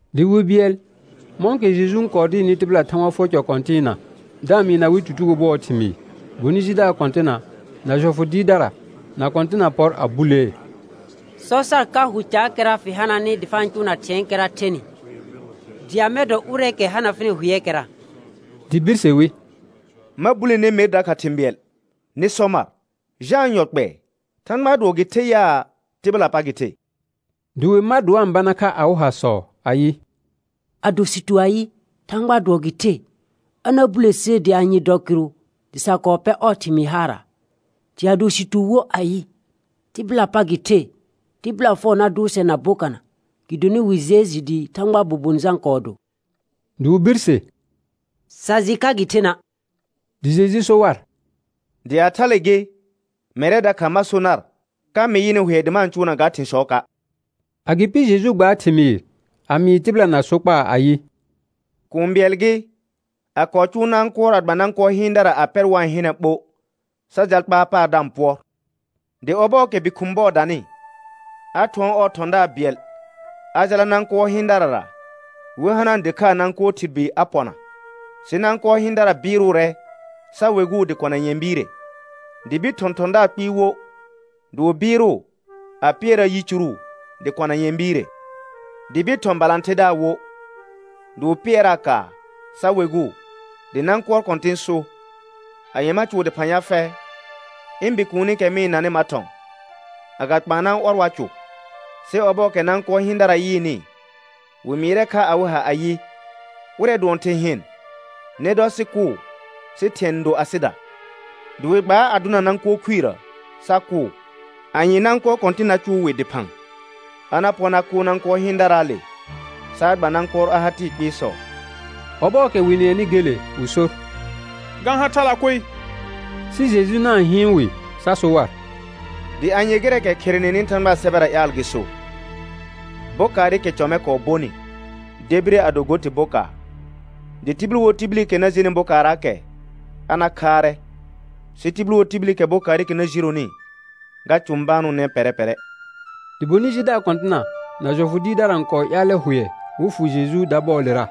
Dɩ wi bɩɛl mɔ̃kɛ Jeju n kɔɔ dɩɩrnɩ tɩbɩla Thãgba fʋɔr cɔ kɔ̃tɩɩna, da-n mɩɩna wɩ tutugo bʋɔɔ thɩmɩɩ, bonɩ jidaar kɔ̃tɩna na jɔfʋ dɩɩrdara na kɔ̃tɩna pɔr a bulee: Sɔ sar ka hʋ caakɛra fɩ hananɩ dɩ fa-n cʋʋna thɩ̃ɛɛkɛra thenɩ, dɩ amɛ dɔ ʋrɛɛkɛ hana fɩnɩ hʋɛɛkɛra? Dɩ birse wi: Ma bule ner mer dakha thɩ̃ bɩɛl. Nɩ sɔ mar: Jãa yɔ kpɛɛ Thãgbaa dʋɔ gɩ the yaa, tɩbɩlaa pa gɩ the? Dɩ wɩ mar dɩ wa-n bana kha awɩ hasɔ ayɩ: Ado sɩ tu ayɩ: Thãgbaa dʋɔ gɩ the, a na bule ser dɩ anye dɔ kɩrʋ dɩ sa kɔɔ pɛ ɔɔ thɩmɩɩ haara'. Dɩ ado sɩ tu wo ayɩ: Tɩbɩlaa pa gɩ the, tɩbɩla fɛʋ na dʋʋr sɛr na bokana, gɩdonɩ wɩ jɩɛ jɩ dɩ Thãgbaa bobon Jã kɔɔ do. Dɩ wɩ birse: Sa jɩ ka gɩ thena'. Dɩ Jeju so war: Dɩ a thale gɩ, mɛrɛ dakha ma so nar ka mɩ yɩnɩ hʋɛ dɩ ma-n cʋʋna ga thɩ̃sɔɔka'. Agɩpɩ Jeju gbaar thɩmɩɩr a mɩɩ tɩbɩla na sokpaa ayɩ: Kũu bɩɛl gɩ, a kɔɔ cʋʋ nãkʋɔr a gba nãkʋɔr hɩɩndara a pɛr wa-n hɩnɛ ɓo, sa jal kpaar paar da-n pʋɔr. Dɩ ɔbɔɔkɛ bi khʋ̃ bɔɔ danɩ, a thʋɔn ɔɔ thɔ̃daar bɩɛl a jala nãkʋɔr hɩɩndarara wɩ hanaa dɩkhaa nãkʋɔr thɩr bi a pɔna. Sɩ nãkʋɔr hɩɩndara bɩɩrʋʋrɛ sa weguu dɩ kɔna nyɛ̃ biire. Dɩ bir thɔ̃ thɔ̃daar kpɩɩ wo, dɩ wɩ bɩɩrʋʋ a pɩɛraa yicuru dɩ kɔna nyɛ̃ biire. Dɩ bir thɔ̃ balãtherdaar wo, dɩ wɩ pɩɛraa kaar sa weguu. Dɩ nãkʋɔr kɔ̃tɩn so: Anye ma cʋʋ dɩphã ya fɛ? Ɩ̃ bikuunikɛ mɩ-n nanɩ ma thɔ̃. Agakpaana ɔr wa cʋ. Sɩ ɔbɔɔkɛ nãkʋɔr hɩɩndara yɩɩnɩ, wɩ mɩɩrɛ kha awɩ ha ayɩ: Ʋrɛ dʋɔn thɩ̃ hɩn, nɩ dɔ sɩ kʋʋ sɩ thɩ̃ɛ n do asɩda. Dɩ wɩ gbaa a dʋna nãkʋɔr khuirə sa kʋʋ. Anye nãkʋɔr kɔ̃tɩn na cʋʋ wɩ dɩphã? A na pɔr na kʋʋr nãkʋɔr hɩɩndaraale sa a gba nãkʋɔr a ha tɩɩ kpɩɩsɔ. Ɔbɔɔkɛ wɩ nɩɛnɩ gele wɩ sor: Ga-n ha thala koe. Sɩ Jeju na-n hɩɩn wɩ sa so war: Dɩ anye gɩrɛɛkɛ kherenenɩ Thãgbaa sɛbɛra ƴaal gɩ so: «Bokaarɩkɛ cɔ mɛ kɔɔ bonɩ debire a do go tɩ bokaar»? Dɩ tibil wo tibilikɛ na jenɩ bokaarraakɛ a na khaarɛ, sɩ tibil wo tibilikɛ bokaarɩkɛ na jironi, ga cʋ̃banʋʋnɛ pɛrɛ pɛrɛ. Dɩ bonɩ jidaar kɔ̃tɩna na jɔfʋ dɩɩrdara n kɔɔ ƴaalɛ hʋɛ wɩ fʋ Jeju dabɔɔlera,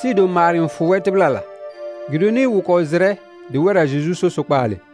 sɩɩ do maar n fʋ wɛr tɩbɩlala. Gɩdonɩ wɩ kɔɔ jɩrɛ dɩ wɛrra Jeju so sokpaale.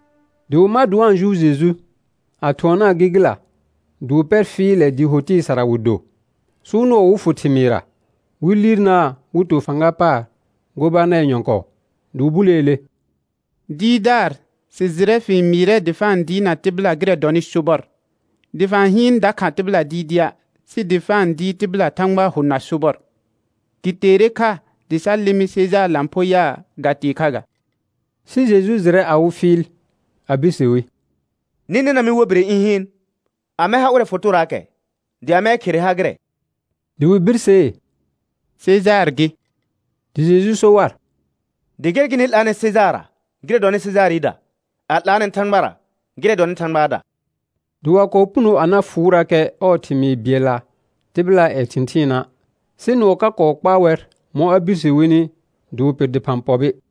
Dɩ wɩ mar dɩ wa-n jʋʋr Jeju, a thʋɔnaa gɩgɩla dɩ wɩ pɛr fɩɩlɛ dɩɩ ho tɩɩ sara wɩ do, sɩ wɩ nʋɔ wɩ fʋ thɩmɩɩrra, wɩ liirnaa wɩ to fãga paar gobanɛr nyɔ̃kɔɔ. Dɩ wɩ buleele: Dɩɩrdaar, sɩ jɩrɛ fɩ-n mɩɩrɛ dɩ fa-n dɩɩrna tɩbɩla gɩrɛ dɔnɩ sobɔr, dɩ fa-n hɩɩn dakha tɩbɩla dɩɩdɩa' sɩ dɩ fa-n dɩɩr tɩbɩla Thãgbaa hʋ na sobɔr. Gɩ teere kha dɩ sa lɩmɩ Sejaar lãpho yaa, ga tee kha ga? Sɩ Jeju jɩrɛ awɩ fɩɩl, a birse wi: Nɩ nɛna mɩ war bire ɩ̃ hɩɩn. Amɛ ha ʋrɛ fotoraakɛ? Dɩ amɛɛ khere ha gɩrɛ? Dɩ wɩ birsee: Sejaar gɩ. Dɩ Jeju so war: Dɩ gɛr gɩ nɩ 'laanɛ Sejaarra gɩrɛ dɔnɩ Sejaarɩda, a 'laanɛ Thãgbara gɩrɛ dɔhɩ Thãgbaada. Dɩ wa kɔɔ puno a na fʋʋrakɛ ɔɔ thɩmɩɩ bɩɛlla tɩbɩlaa ƴɛ thɩ̃thɩɩna', sɩ nʋɔ ka kɔɔ kpaa wɛr mɔ̃ a birse wini dɩ wɩ pɩr dɩphã pɔbɩ.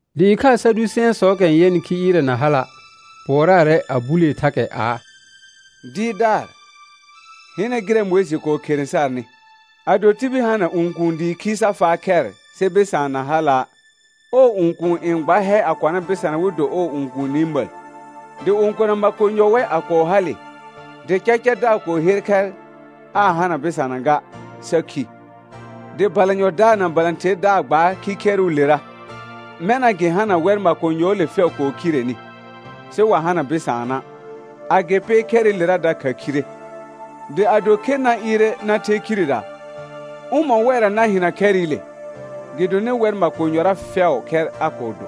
Dɩ ɩkhaa Sadʋsɛ̃ɛsɔɔkɛ n yɛnɩ khi ɩɩrɛ na hala' pʋɔraarɛ, a bulee thakɛ aa: Dɩɩrdaar, hɩnɛ gɩrɛ Mʋɩjɩ kɔɔ khere sarnɩ: «Ado tibil hana õkuun dɩ khi sa faa khɛr sɩ bɩsaan na hala', ɔɔ õkuun n gba hɛ a kɔna bɩsana wɩ do ɔɔ õkuuni məl.» Dɩ õkona makonyɔ wɛ a kɔɔ hale, dɩ cacadaar kɔɔ her khɛr aa hana bɩsana ga, sa khi. Dɩ balanyɔdaar na balãtherdaar gbaar khikhɛrʋʋlera. Mɛna gɩ hana wɛr makonyɔɔle fɛʋ kɔɔ khireni, sɩ wa hana bɩsaana'. Agɩpɩ khɛrɩlera dakha khire. Dɩ ado khe na ɩɩrɛ na the khirera, ʋmɔ̃ wɛrra na hɩna khɛrɩle? Gɩdonɩ wɛr makonyɔra fɛʋʋ khɛr a kɔɔ do.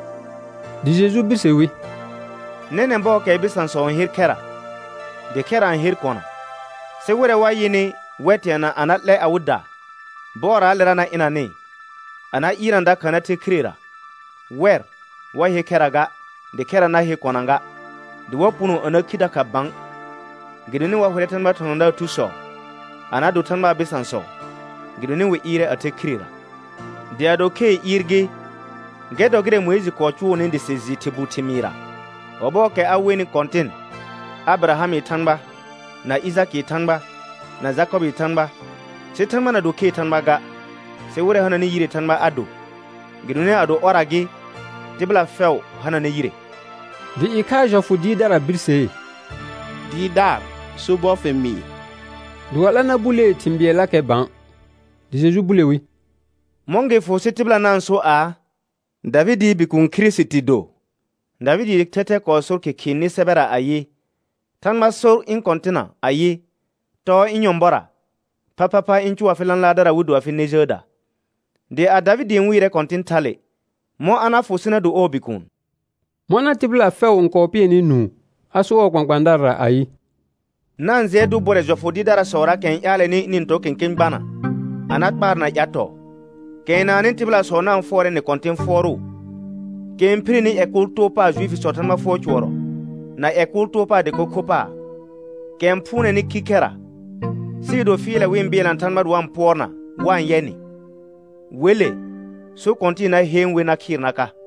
Dɩ Jeju birse wi: Nɛnɛ̃ bɔɔkɛɛ bɩsãsɔ n her khɛra, dɩ khɛra n her kona. Sɩ wɩrɛ wa yɩnɩ, wɛr teana a na 'lɛ awɩda bɔɔraalera na ɩnanɩ a na ɩɩrna dakha na the khirera, wɛr wa he khɛra ga, dɩ khɛra na he kona ga. Dɩ wa puno a na khi dakha bã, gɩdonɩ wa hʋrɛ Thãgbaa thɔ̃thɔ̃daar thusɔ a na do Thãgbaa bɩsãsɔ, gɩdonɩ wɩ ɩɩrɛ a the khirera. Dɩ ado khee ɩɩr gɩ, gɛr dɔ gɩrɛ Mʋɩjɩ kɔɔ cʋʋnɩ dɩ sɩ jɩ thɩr bu thɩmɩɩrra, ɔbɔɔkɛ a wenɩ Kɔ̃tɩn, «Abɩrahamɩ Thãgba, na Ɩjakɩɩ Thãgba, na Jakɔbɩɩ Thãgba». Sɩ Thãgba na do khee Thãgba ga, sɩ wɩrɛ hananɩ yiree Thãgba a do, gɩdonɩ ado ɔrra gɩ, tɩbɩla fɛʋ hananɛ yire. Dɩ ɩkhaa jɔfʋ dɩɩrdara birsee: Dɩɩrdaar, sobɔr fɩ mɩɩ. Dɩ wa 'la na bulee thɩ̃ bɩɛllakɛ bã. Dɩ Jeju bule wi: Mɔ̃ gɩ fʋ sɩ tɩbɩla na-n so aa: Davɩdɩɩ Bikuun Kirisiti do? Davɩdɩɩ thɛthɛ kɔɔ sor Khɩkhɩɩ nɩ sɛbɛra ayɩ: «Thãgba sor ɩ̃ Kɔ̃tɩna ayɩ: Tɔɔ ɩ̃ nyɔ̃bɔra, phaphapha ɩ̃ cʋʋ afɩ lãlaardara wɩ do afɩ nɛ jəəda.» Dɩ a Davɩdɩ n wɩɩrɛ Kɔ̃tɩn thale, mɔ̃ a na fʋ sɩ na do ɔɔ bikuun? Mɔna tɩbɩla fɛʋ n kɔɔ pɩɛnɩ nũu, a sor ɔɔ kpãkpãadarara ayɩ: Na-n jɩɛ dʋ bʋrɛ jɔfʋ dɩɩrdarasɔraakɛ n ƴaalɛnɩ ɩnɩ-n tɔ kẽkẽ gbana a na kpaarna ƴatɔɔ, kɛ n naannɩ tɩbɩlasɔ na-n fʋɔrɛnɩ kɔ̃tɩ̃ fʋɔrʋʋ, kɛ n phireni ƴɛ kʋʋl too paar Juifisɔɔ Thãgba fʋɔr cʋɔrɔ, na ƴɛ kʋʋl too paar dɩko kho paar, kɛ n phʋʋnɛnɩ khikhɛra, sɩɩ do fɩɩlɛ wɩ-n bɩɛlna Thãgba dɩ wa-n pʋɔrna wa-n yɛ nɩ. Wele so kɔ̃tɩ̃ɩ na heen wer na khɩɩr na ka.